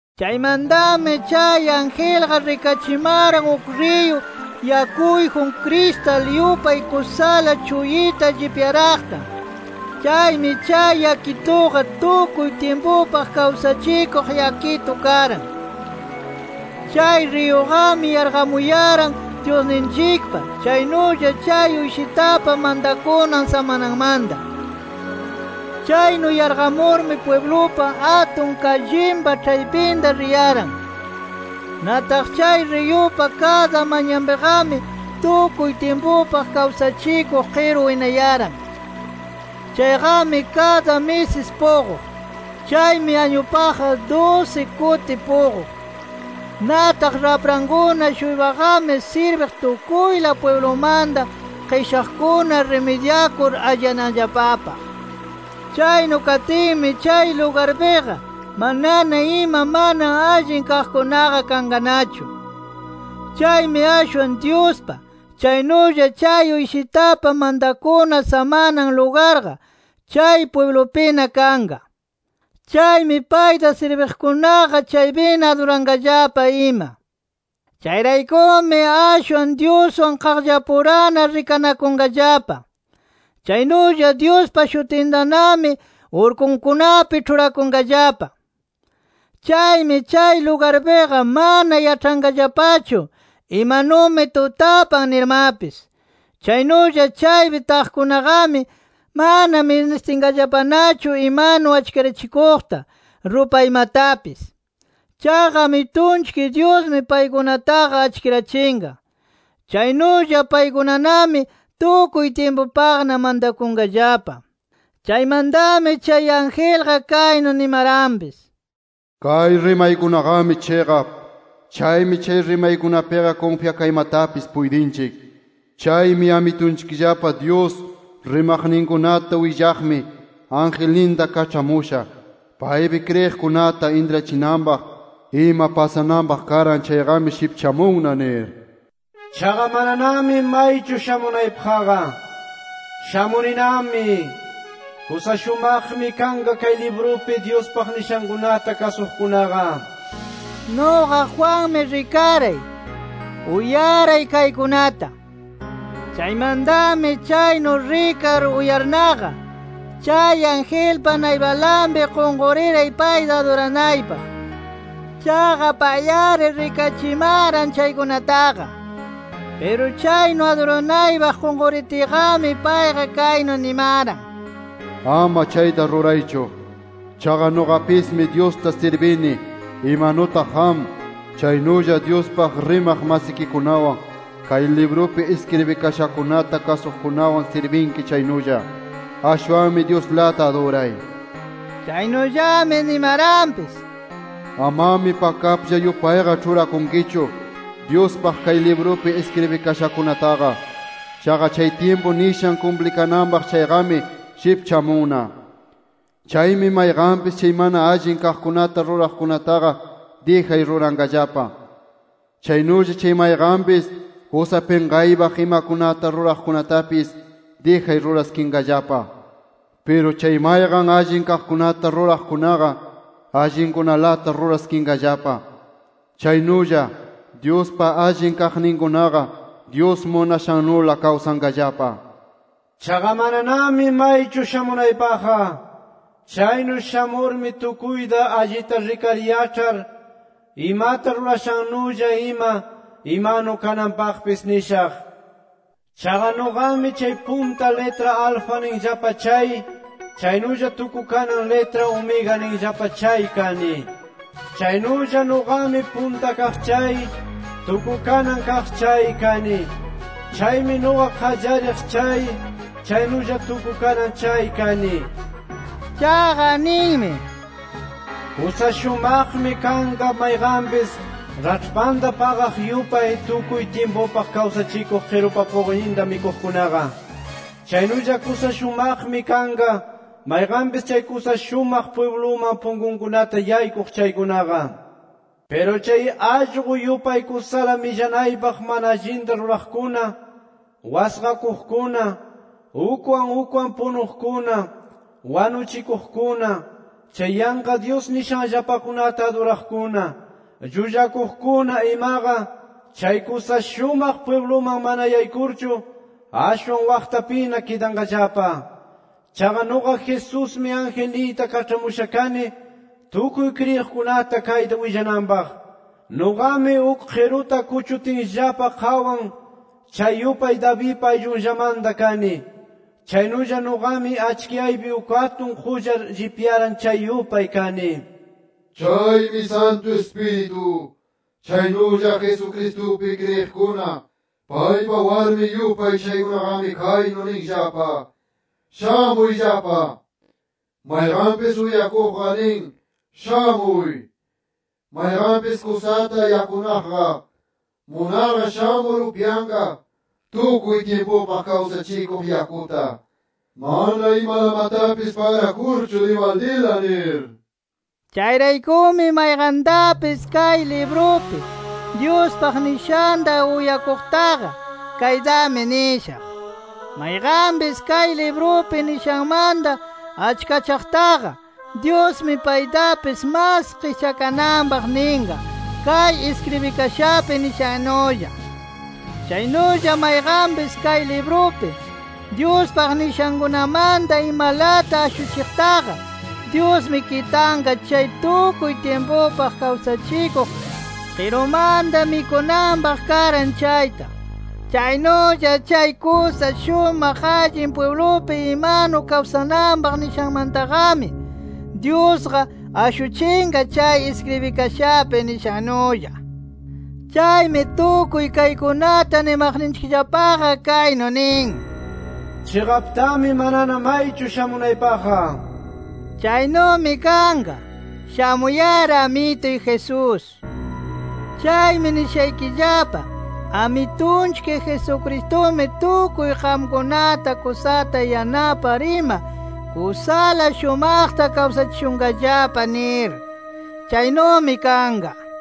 Chaymantami chay angelqa rikachimaran uk riyu yakuyjun, kristal yupay kusala chuyita llipyaraqta. Chaymi chay yakituqa tukuy tyimpupaq kawsachikuq yakitu karan. Chay riyuqami yarqamuyaran Dyusninchikpa, chaynulla chay Uyshitapa mantakunan samananmanta. Chaynu yarqamurmi pwiblupa atun kallinpa ĉhaypinta riyaran. Nataq chay riyupa kada manyanpiqami, tukuy tyimpupaq kawsachikuq qiru winayaran. Chayqami kada misis puquq. Chaymi añupaqqa, dusi kuti puquq. Nataq raprankuna-shuypaqami, sirbiq tukuyla pwiblumanta qishaqkuna rimidyakur alliyananllapapaq. Chaynu katinmi chay lugarpiqa, manana ima mana allin kaqkunaqa kanqanachu. Chaymi ashwan Dyuspa, chaynulla chay Uyshitapa mantakuna samanan lugarqa, chay pwiblupina kanqa. Chaymi payta sirbiqkunaqa, chaypina aduranqallapa ima. Chayraykumi ashwan Dyuswan qaqllapurana rikanakunqallapa. Chaynulla Dyuspa shutintanami urkunkunapi ĉhurakunqallapa. Chaymi chay lugarpiqa mana yaĉhanqallapachu, imanumi tutapan nirmapis. Chaynulla chaypi taqkunaqami, mana ministinqallapanachu imanu achkirachikuqta, rupaymatapis. Chaqa Amitunchik Dyusmi paykunataqa achkirachinqa. Chaynulla paykunanami tukuy tyimpupaqna mantakunqallapa. Chaymantami chay angelqa, kaynu nimaranpis: “Kay rimaykunaqami chiqap. Chaymi chay rimaykunapiqa kunfyakaymatapis puytinchik. Chaymi Amitunchikllapa Dyus rimaqninkunata willaqmi, angelninta kaĉhamusha, paypi kriyiqkunata intrachinanpaq ima pasananpaq karan chayqami shipchamunna” nir. “¡Chaqa mananami maychu shamunaypaqqa! ¡Shamuninami! ¡Kusa shumaqmi kanqa kay librupi Dyuspaq nishankunata kasuqkunaqa!” nir. Nuqa Juanmi rikaray, uyaray kaykunata. Chaymantami chaynu rikar, uyarnaqa, chay angelpa naypanlapi qunquriray payta aduranaypaq. Chaqa pay-ari rikachimaran chaykunataqa. Piru chaynu aduranaypaq qunquritiyqami, payqa kaynu nimaran: “Ama chayta ruraychu. Chaqa nuqapismi Dyusta sirbini, imanutaq qam, chaynulla Dyuspaq rimaq masikikunawan, kay librupi iskribikashakunata kasuqkunawan sirbinki chaynulla. ¡Ashwanmi Dyuslata aduray!” nir. Chaynullami nimaranpis: “Amami pakaplla yupayqa ĉhurakunkichu, Dyuspaq kay librupi iskribikashakunataqa. Chaqa chay tyimpu nishan kumplikananpaq chayqami, shipchamunna. Chaymi mayqanpis chay mana allin kaqkunata ruraqkunataqa dijay ruranqallapa. Chaynulla chay mayqanpis kusa pinqaypaq imakunata ruraqkunatapis, dijay ruraskinqallapa. Piru chay mayqan allin kaqkunata ruraqkunaqa, allinkunalata ruraskinqallapa. Chaynulla, Dyuspa allin kaqninkunaqa, Dyus munashannula kawsanqallapa” nir. “Chaqa mananami maychu shamunaypaqqa. Chaynu shamurmi tukuyta allita rikar yaĉhar, imata rurashannulla ima imanu kananpaqpis nishaq. Chaqa nuqami chay punta litra Alfa ninllapa chay, chaynulla tukukanan litra Omega ninllapa chay kani. Chaynulla nuqami Punta Kaq chay, Tukukanan Kaq chay kani. Chaymi nuqa Qallariq chay, chaynulla Tukukanan chay kani” nir. Chaqa ninmi: “Kusa shumaqmi kanqa mayqanpis raĉhpanta paqaq yupay, tukuy tyimpupaq kawsachikuq qirupa puquyninta mikuqkunaqa. Chaynulla kusa shumaqmi kanqa, mayqanpis chay kusa shumaq pwibluman punkukunata yaykuq chaykunaqa nir. Piru chay allqu yupay kusala millanaypaq mana allinta ruraqkuna, wasqakuqkuna, ukwan ukwan punuqkuna, wanuchikuqkuna, chay yanqa dyus nishanllapakunata aduraqkuna, llullakuqkuna imaqa, chay kusa shumaq pwibluman mana yaykurchu, ashwan waqtapina kidanqallapa”. “Chaqa nuqa Jesusmi, angelniyta kaĉhamusha kani, tukuy kriyiqkunata kayta willananpaq. Nuqami uk qiruta kuchutinllapa qawan, chay yupay Davidpa ayllunllamanta kani. Chaynulla nuqami achkiyaypi uk atun qullar llipyaran chay yupay kani” nir. Chaymi Santu Ispiritu, chaynulla Jesucristupi kriyiqkuna paypa warmin yupay chaykunaqami kaynu ninllapa: “¡Shamuyllapa!” Mayqanpis uyakuqqa nin: “¡Shamuy!” Mayqanpis kusata yakunaqqa, munarqa shamur upyanqa tukuy tyimpupaq kawsachikuq yakuta, mana imalamatapis pagrakurchu dibaldila nir. Chayraykumi mayqantapis kay librupi, Dyuspaq nishanta uyakuqtaqa, kaytami nishaq: Mayqanpis kay librupi nishanmanta achkachaqtaqa, Dyusmi paytapis mas qischakananpaq ninqa kay iskribikashapi nishannulla. Chaynulla mayqanpis kay librupi, Dyuspaq nishankunamanta imalata ashuchiqtaqa, Dyusmi kitanqa chay tukuy tyimpupaq kawsachikuq qirumanta mikunanpaq karan chayta. Chaynulla chay kusa shumaq allin pwiblupi imanu kawsananpaq nishanmantaqami, Dyusqa ashuchinqa kay iskribikashapi nishannulla. Chaymi tukuy kaykunata nimaqninchikllapaqa, kaynu nin: “Chiqaptami, manana maychu shamunaypaqqa”. ¡Chaynumi kanqa! ¡Shamuy-ari Amituy Jesús! Chaymi nishaykillapa: Amitunchik Jesucristumi tukuy qamkunata kusata yanapar ima, kusala shumaqta kawsachishunqallapa nir. Chaynumi kanqa.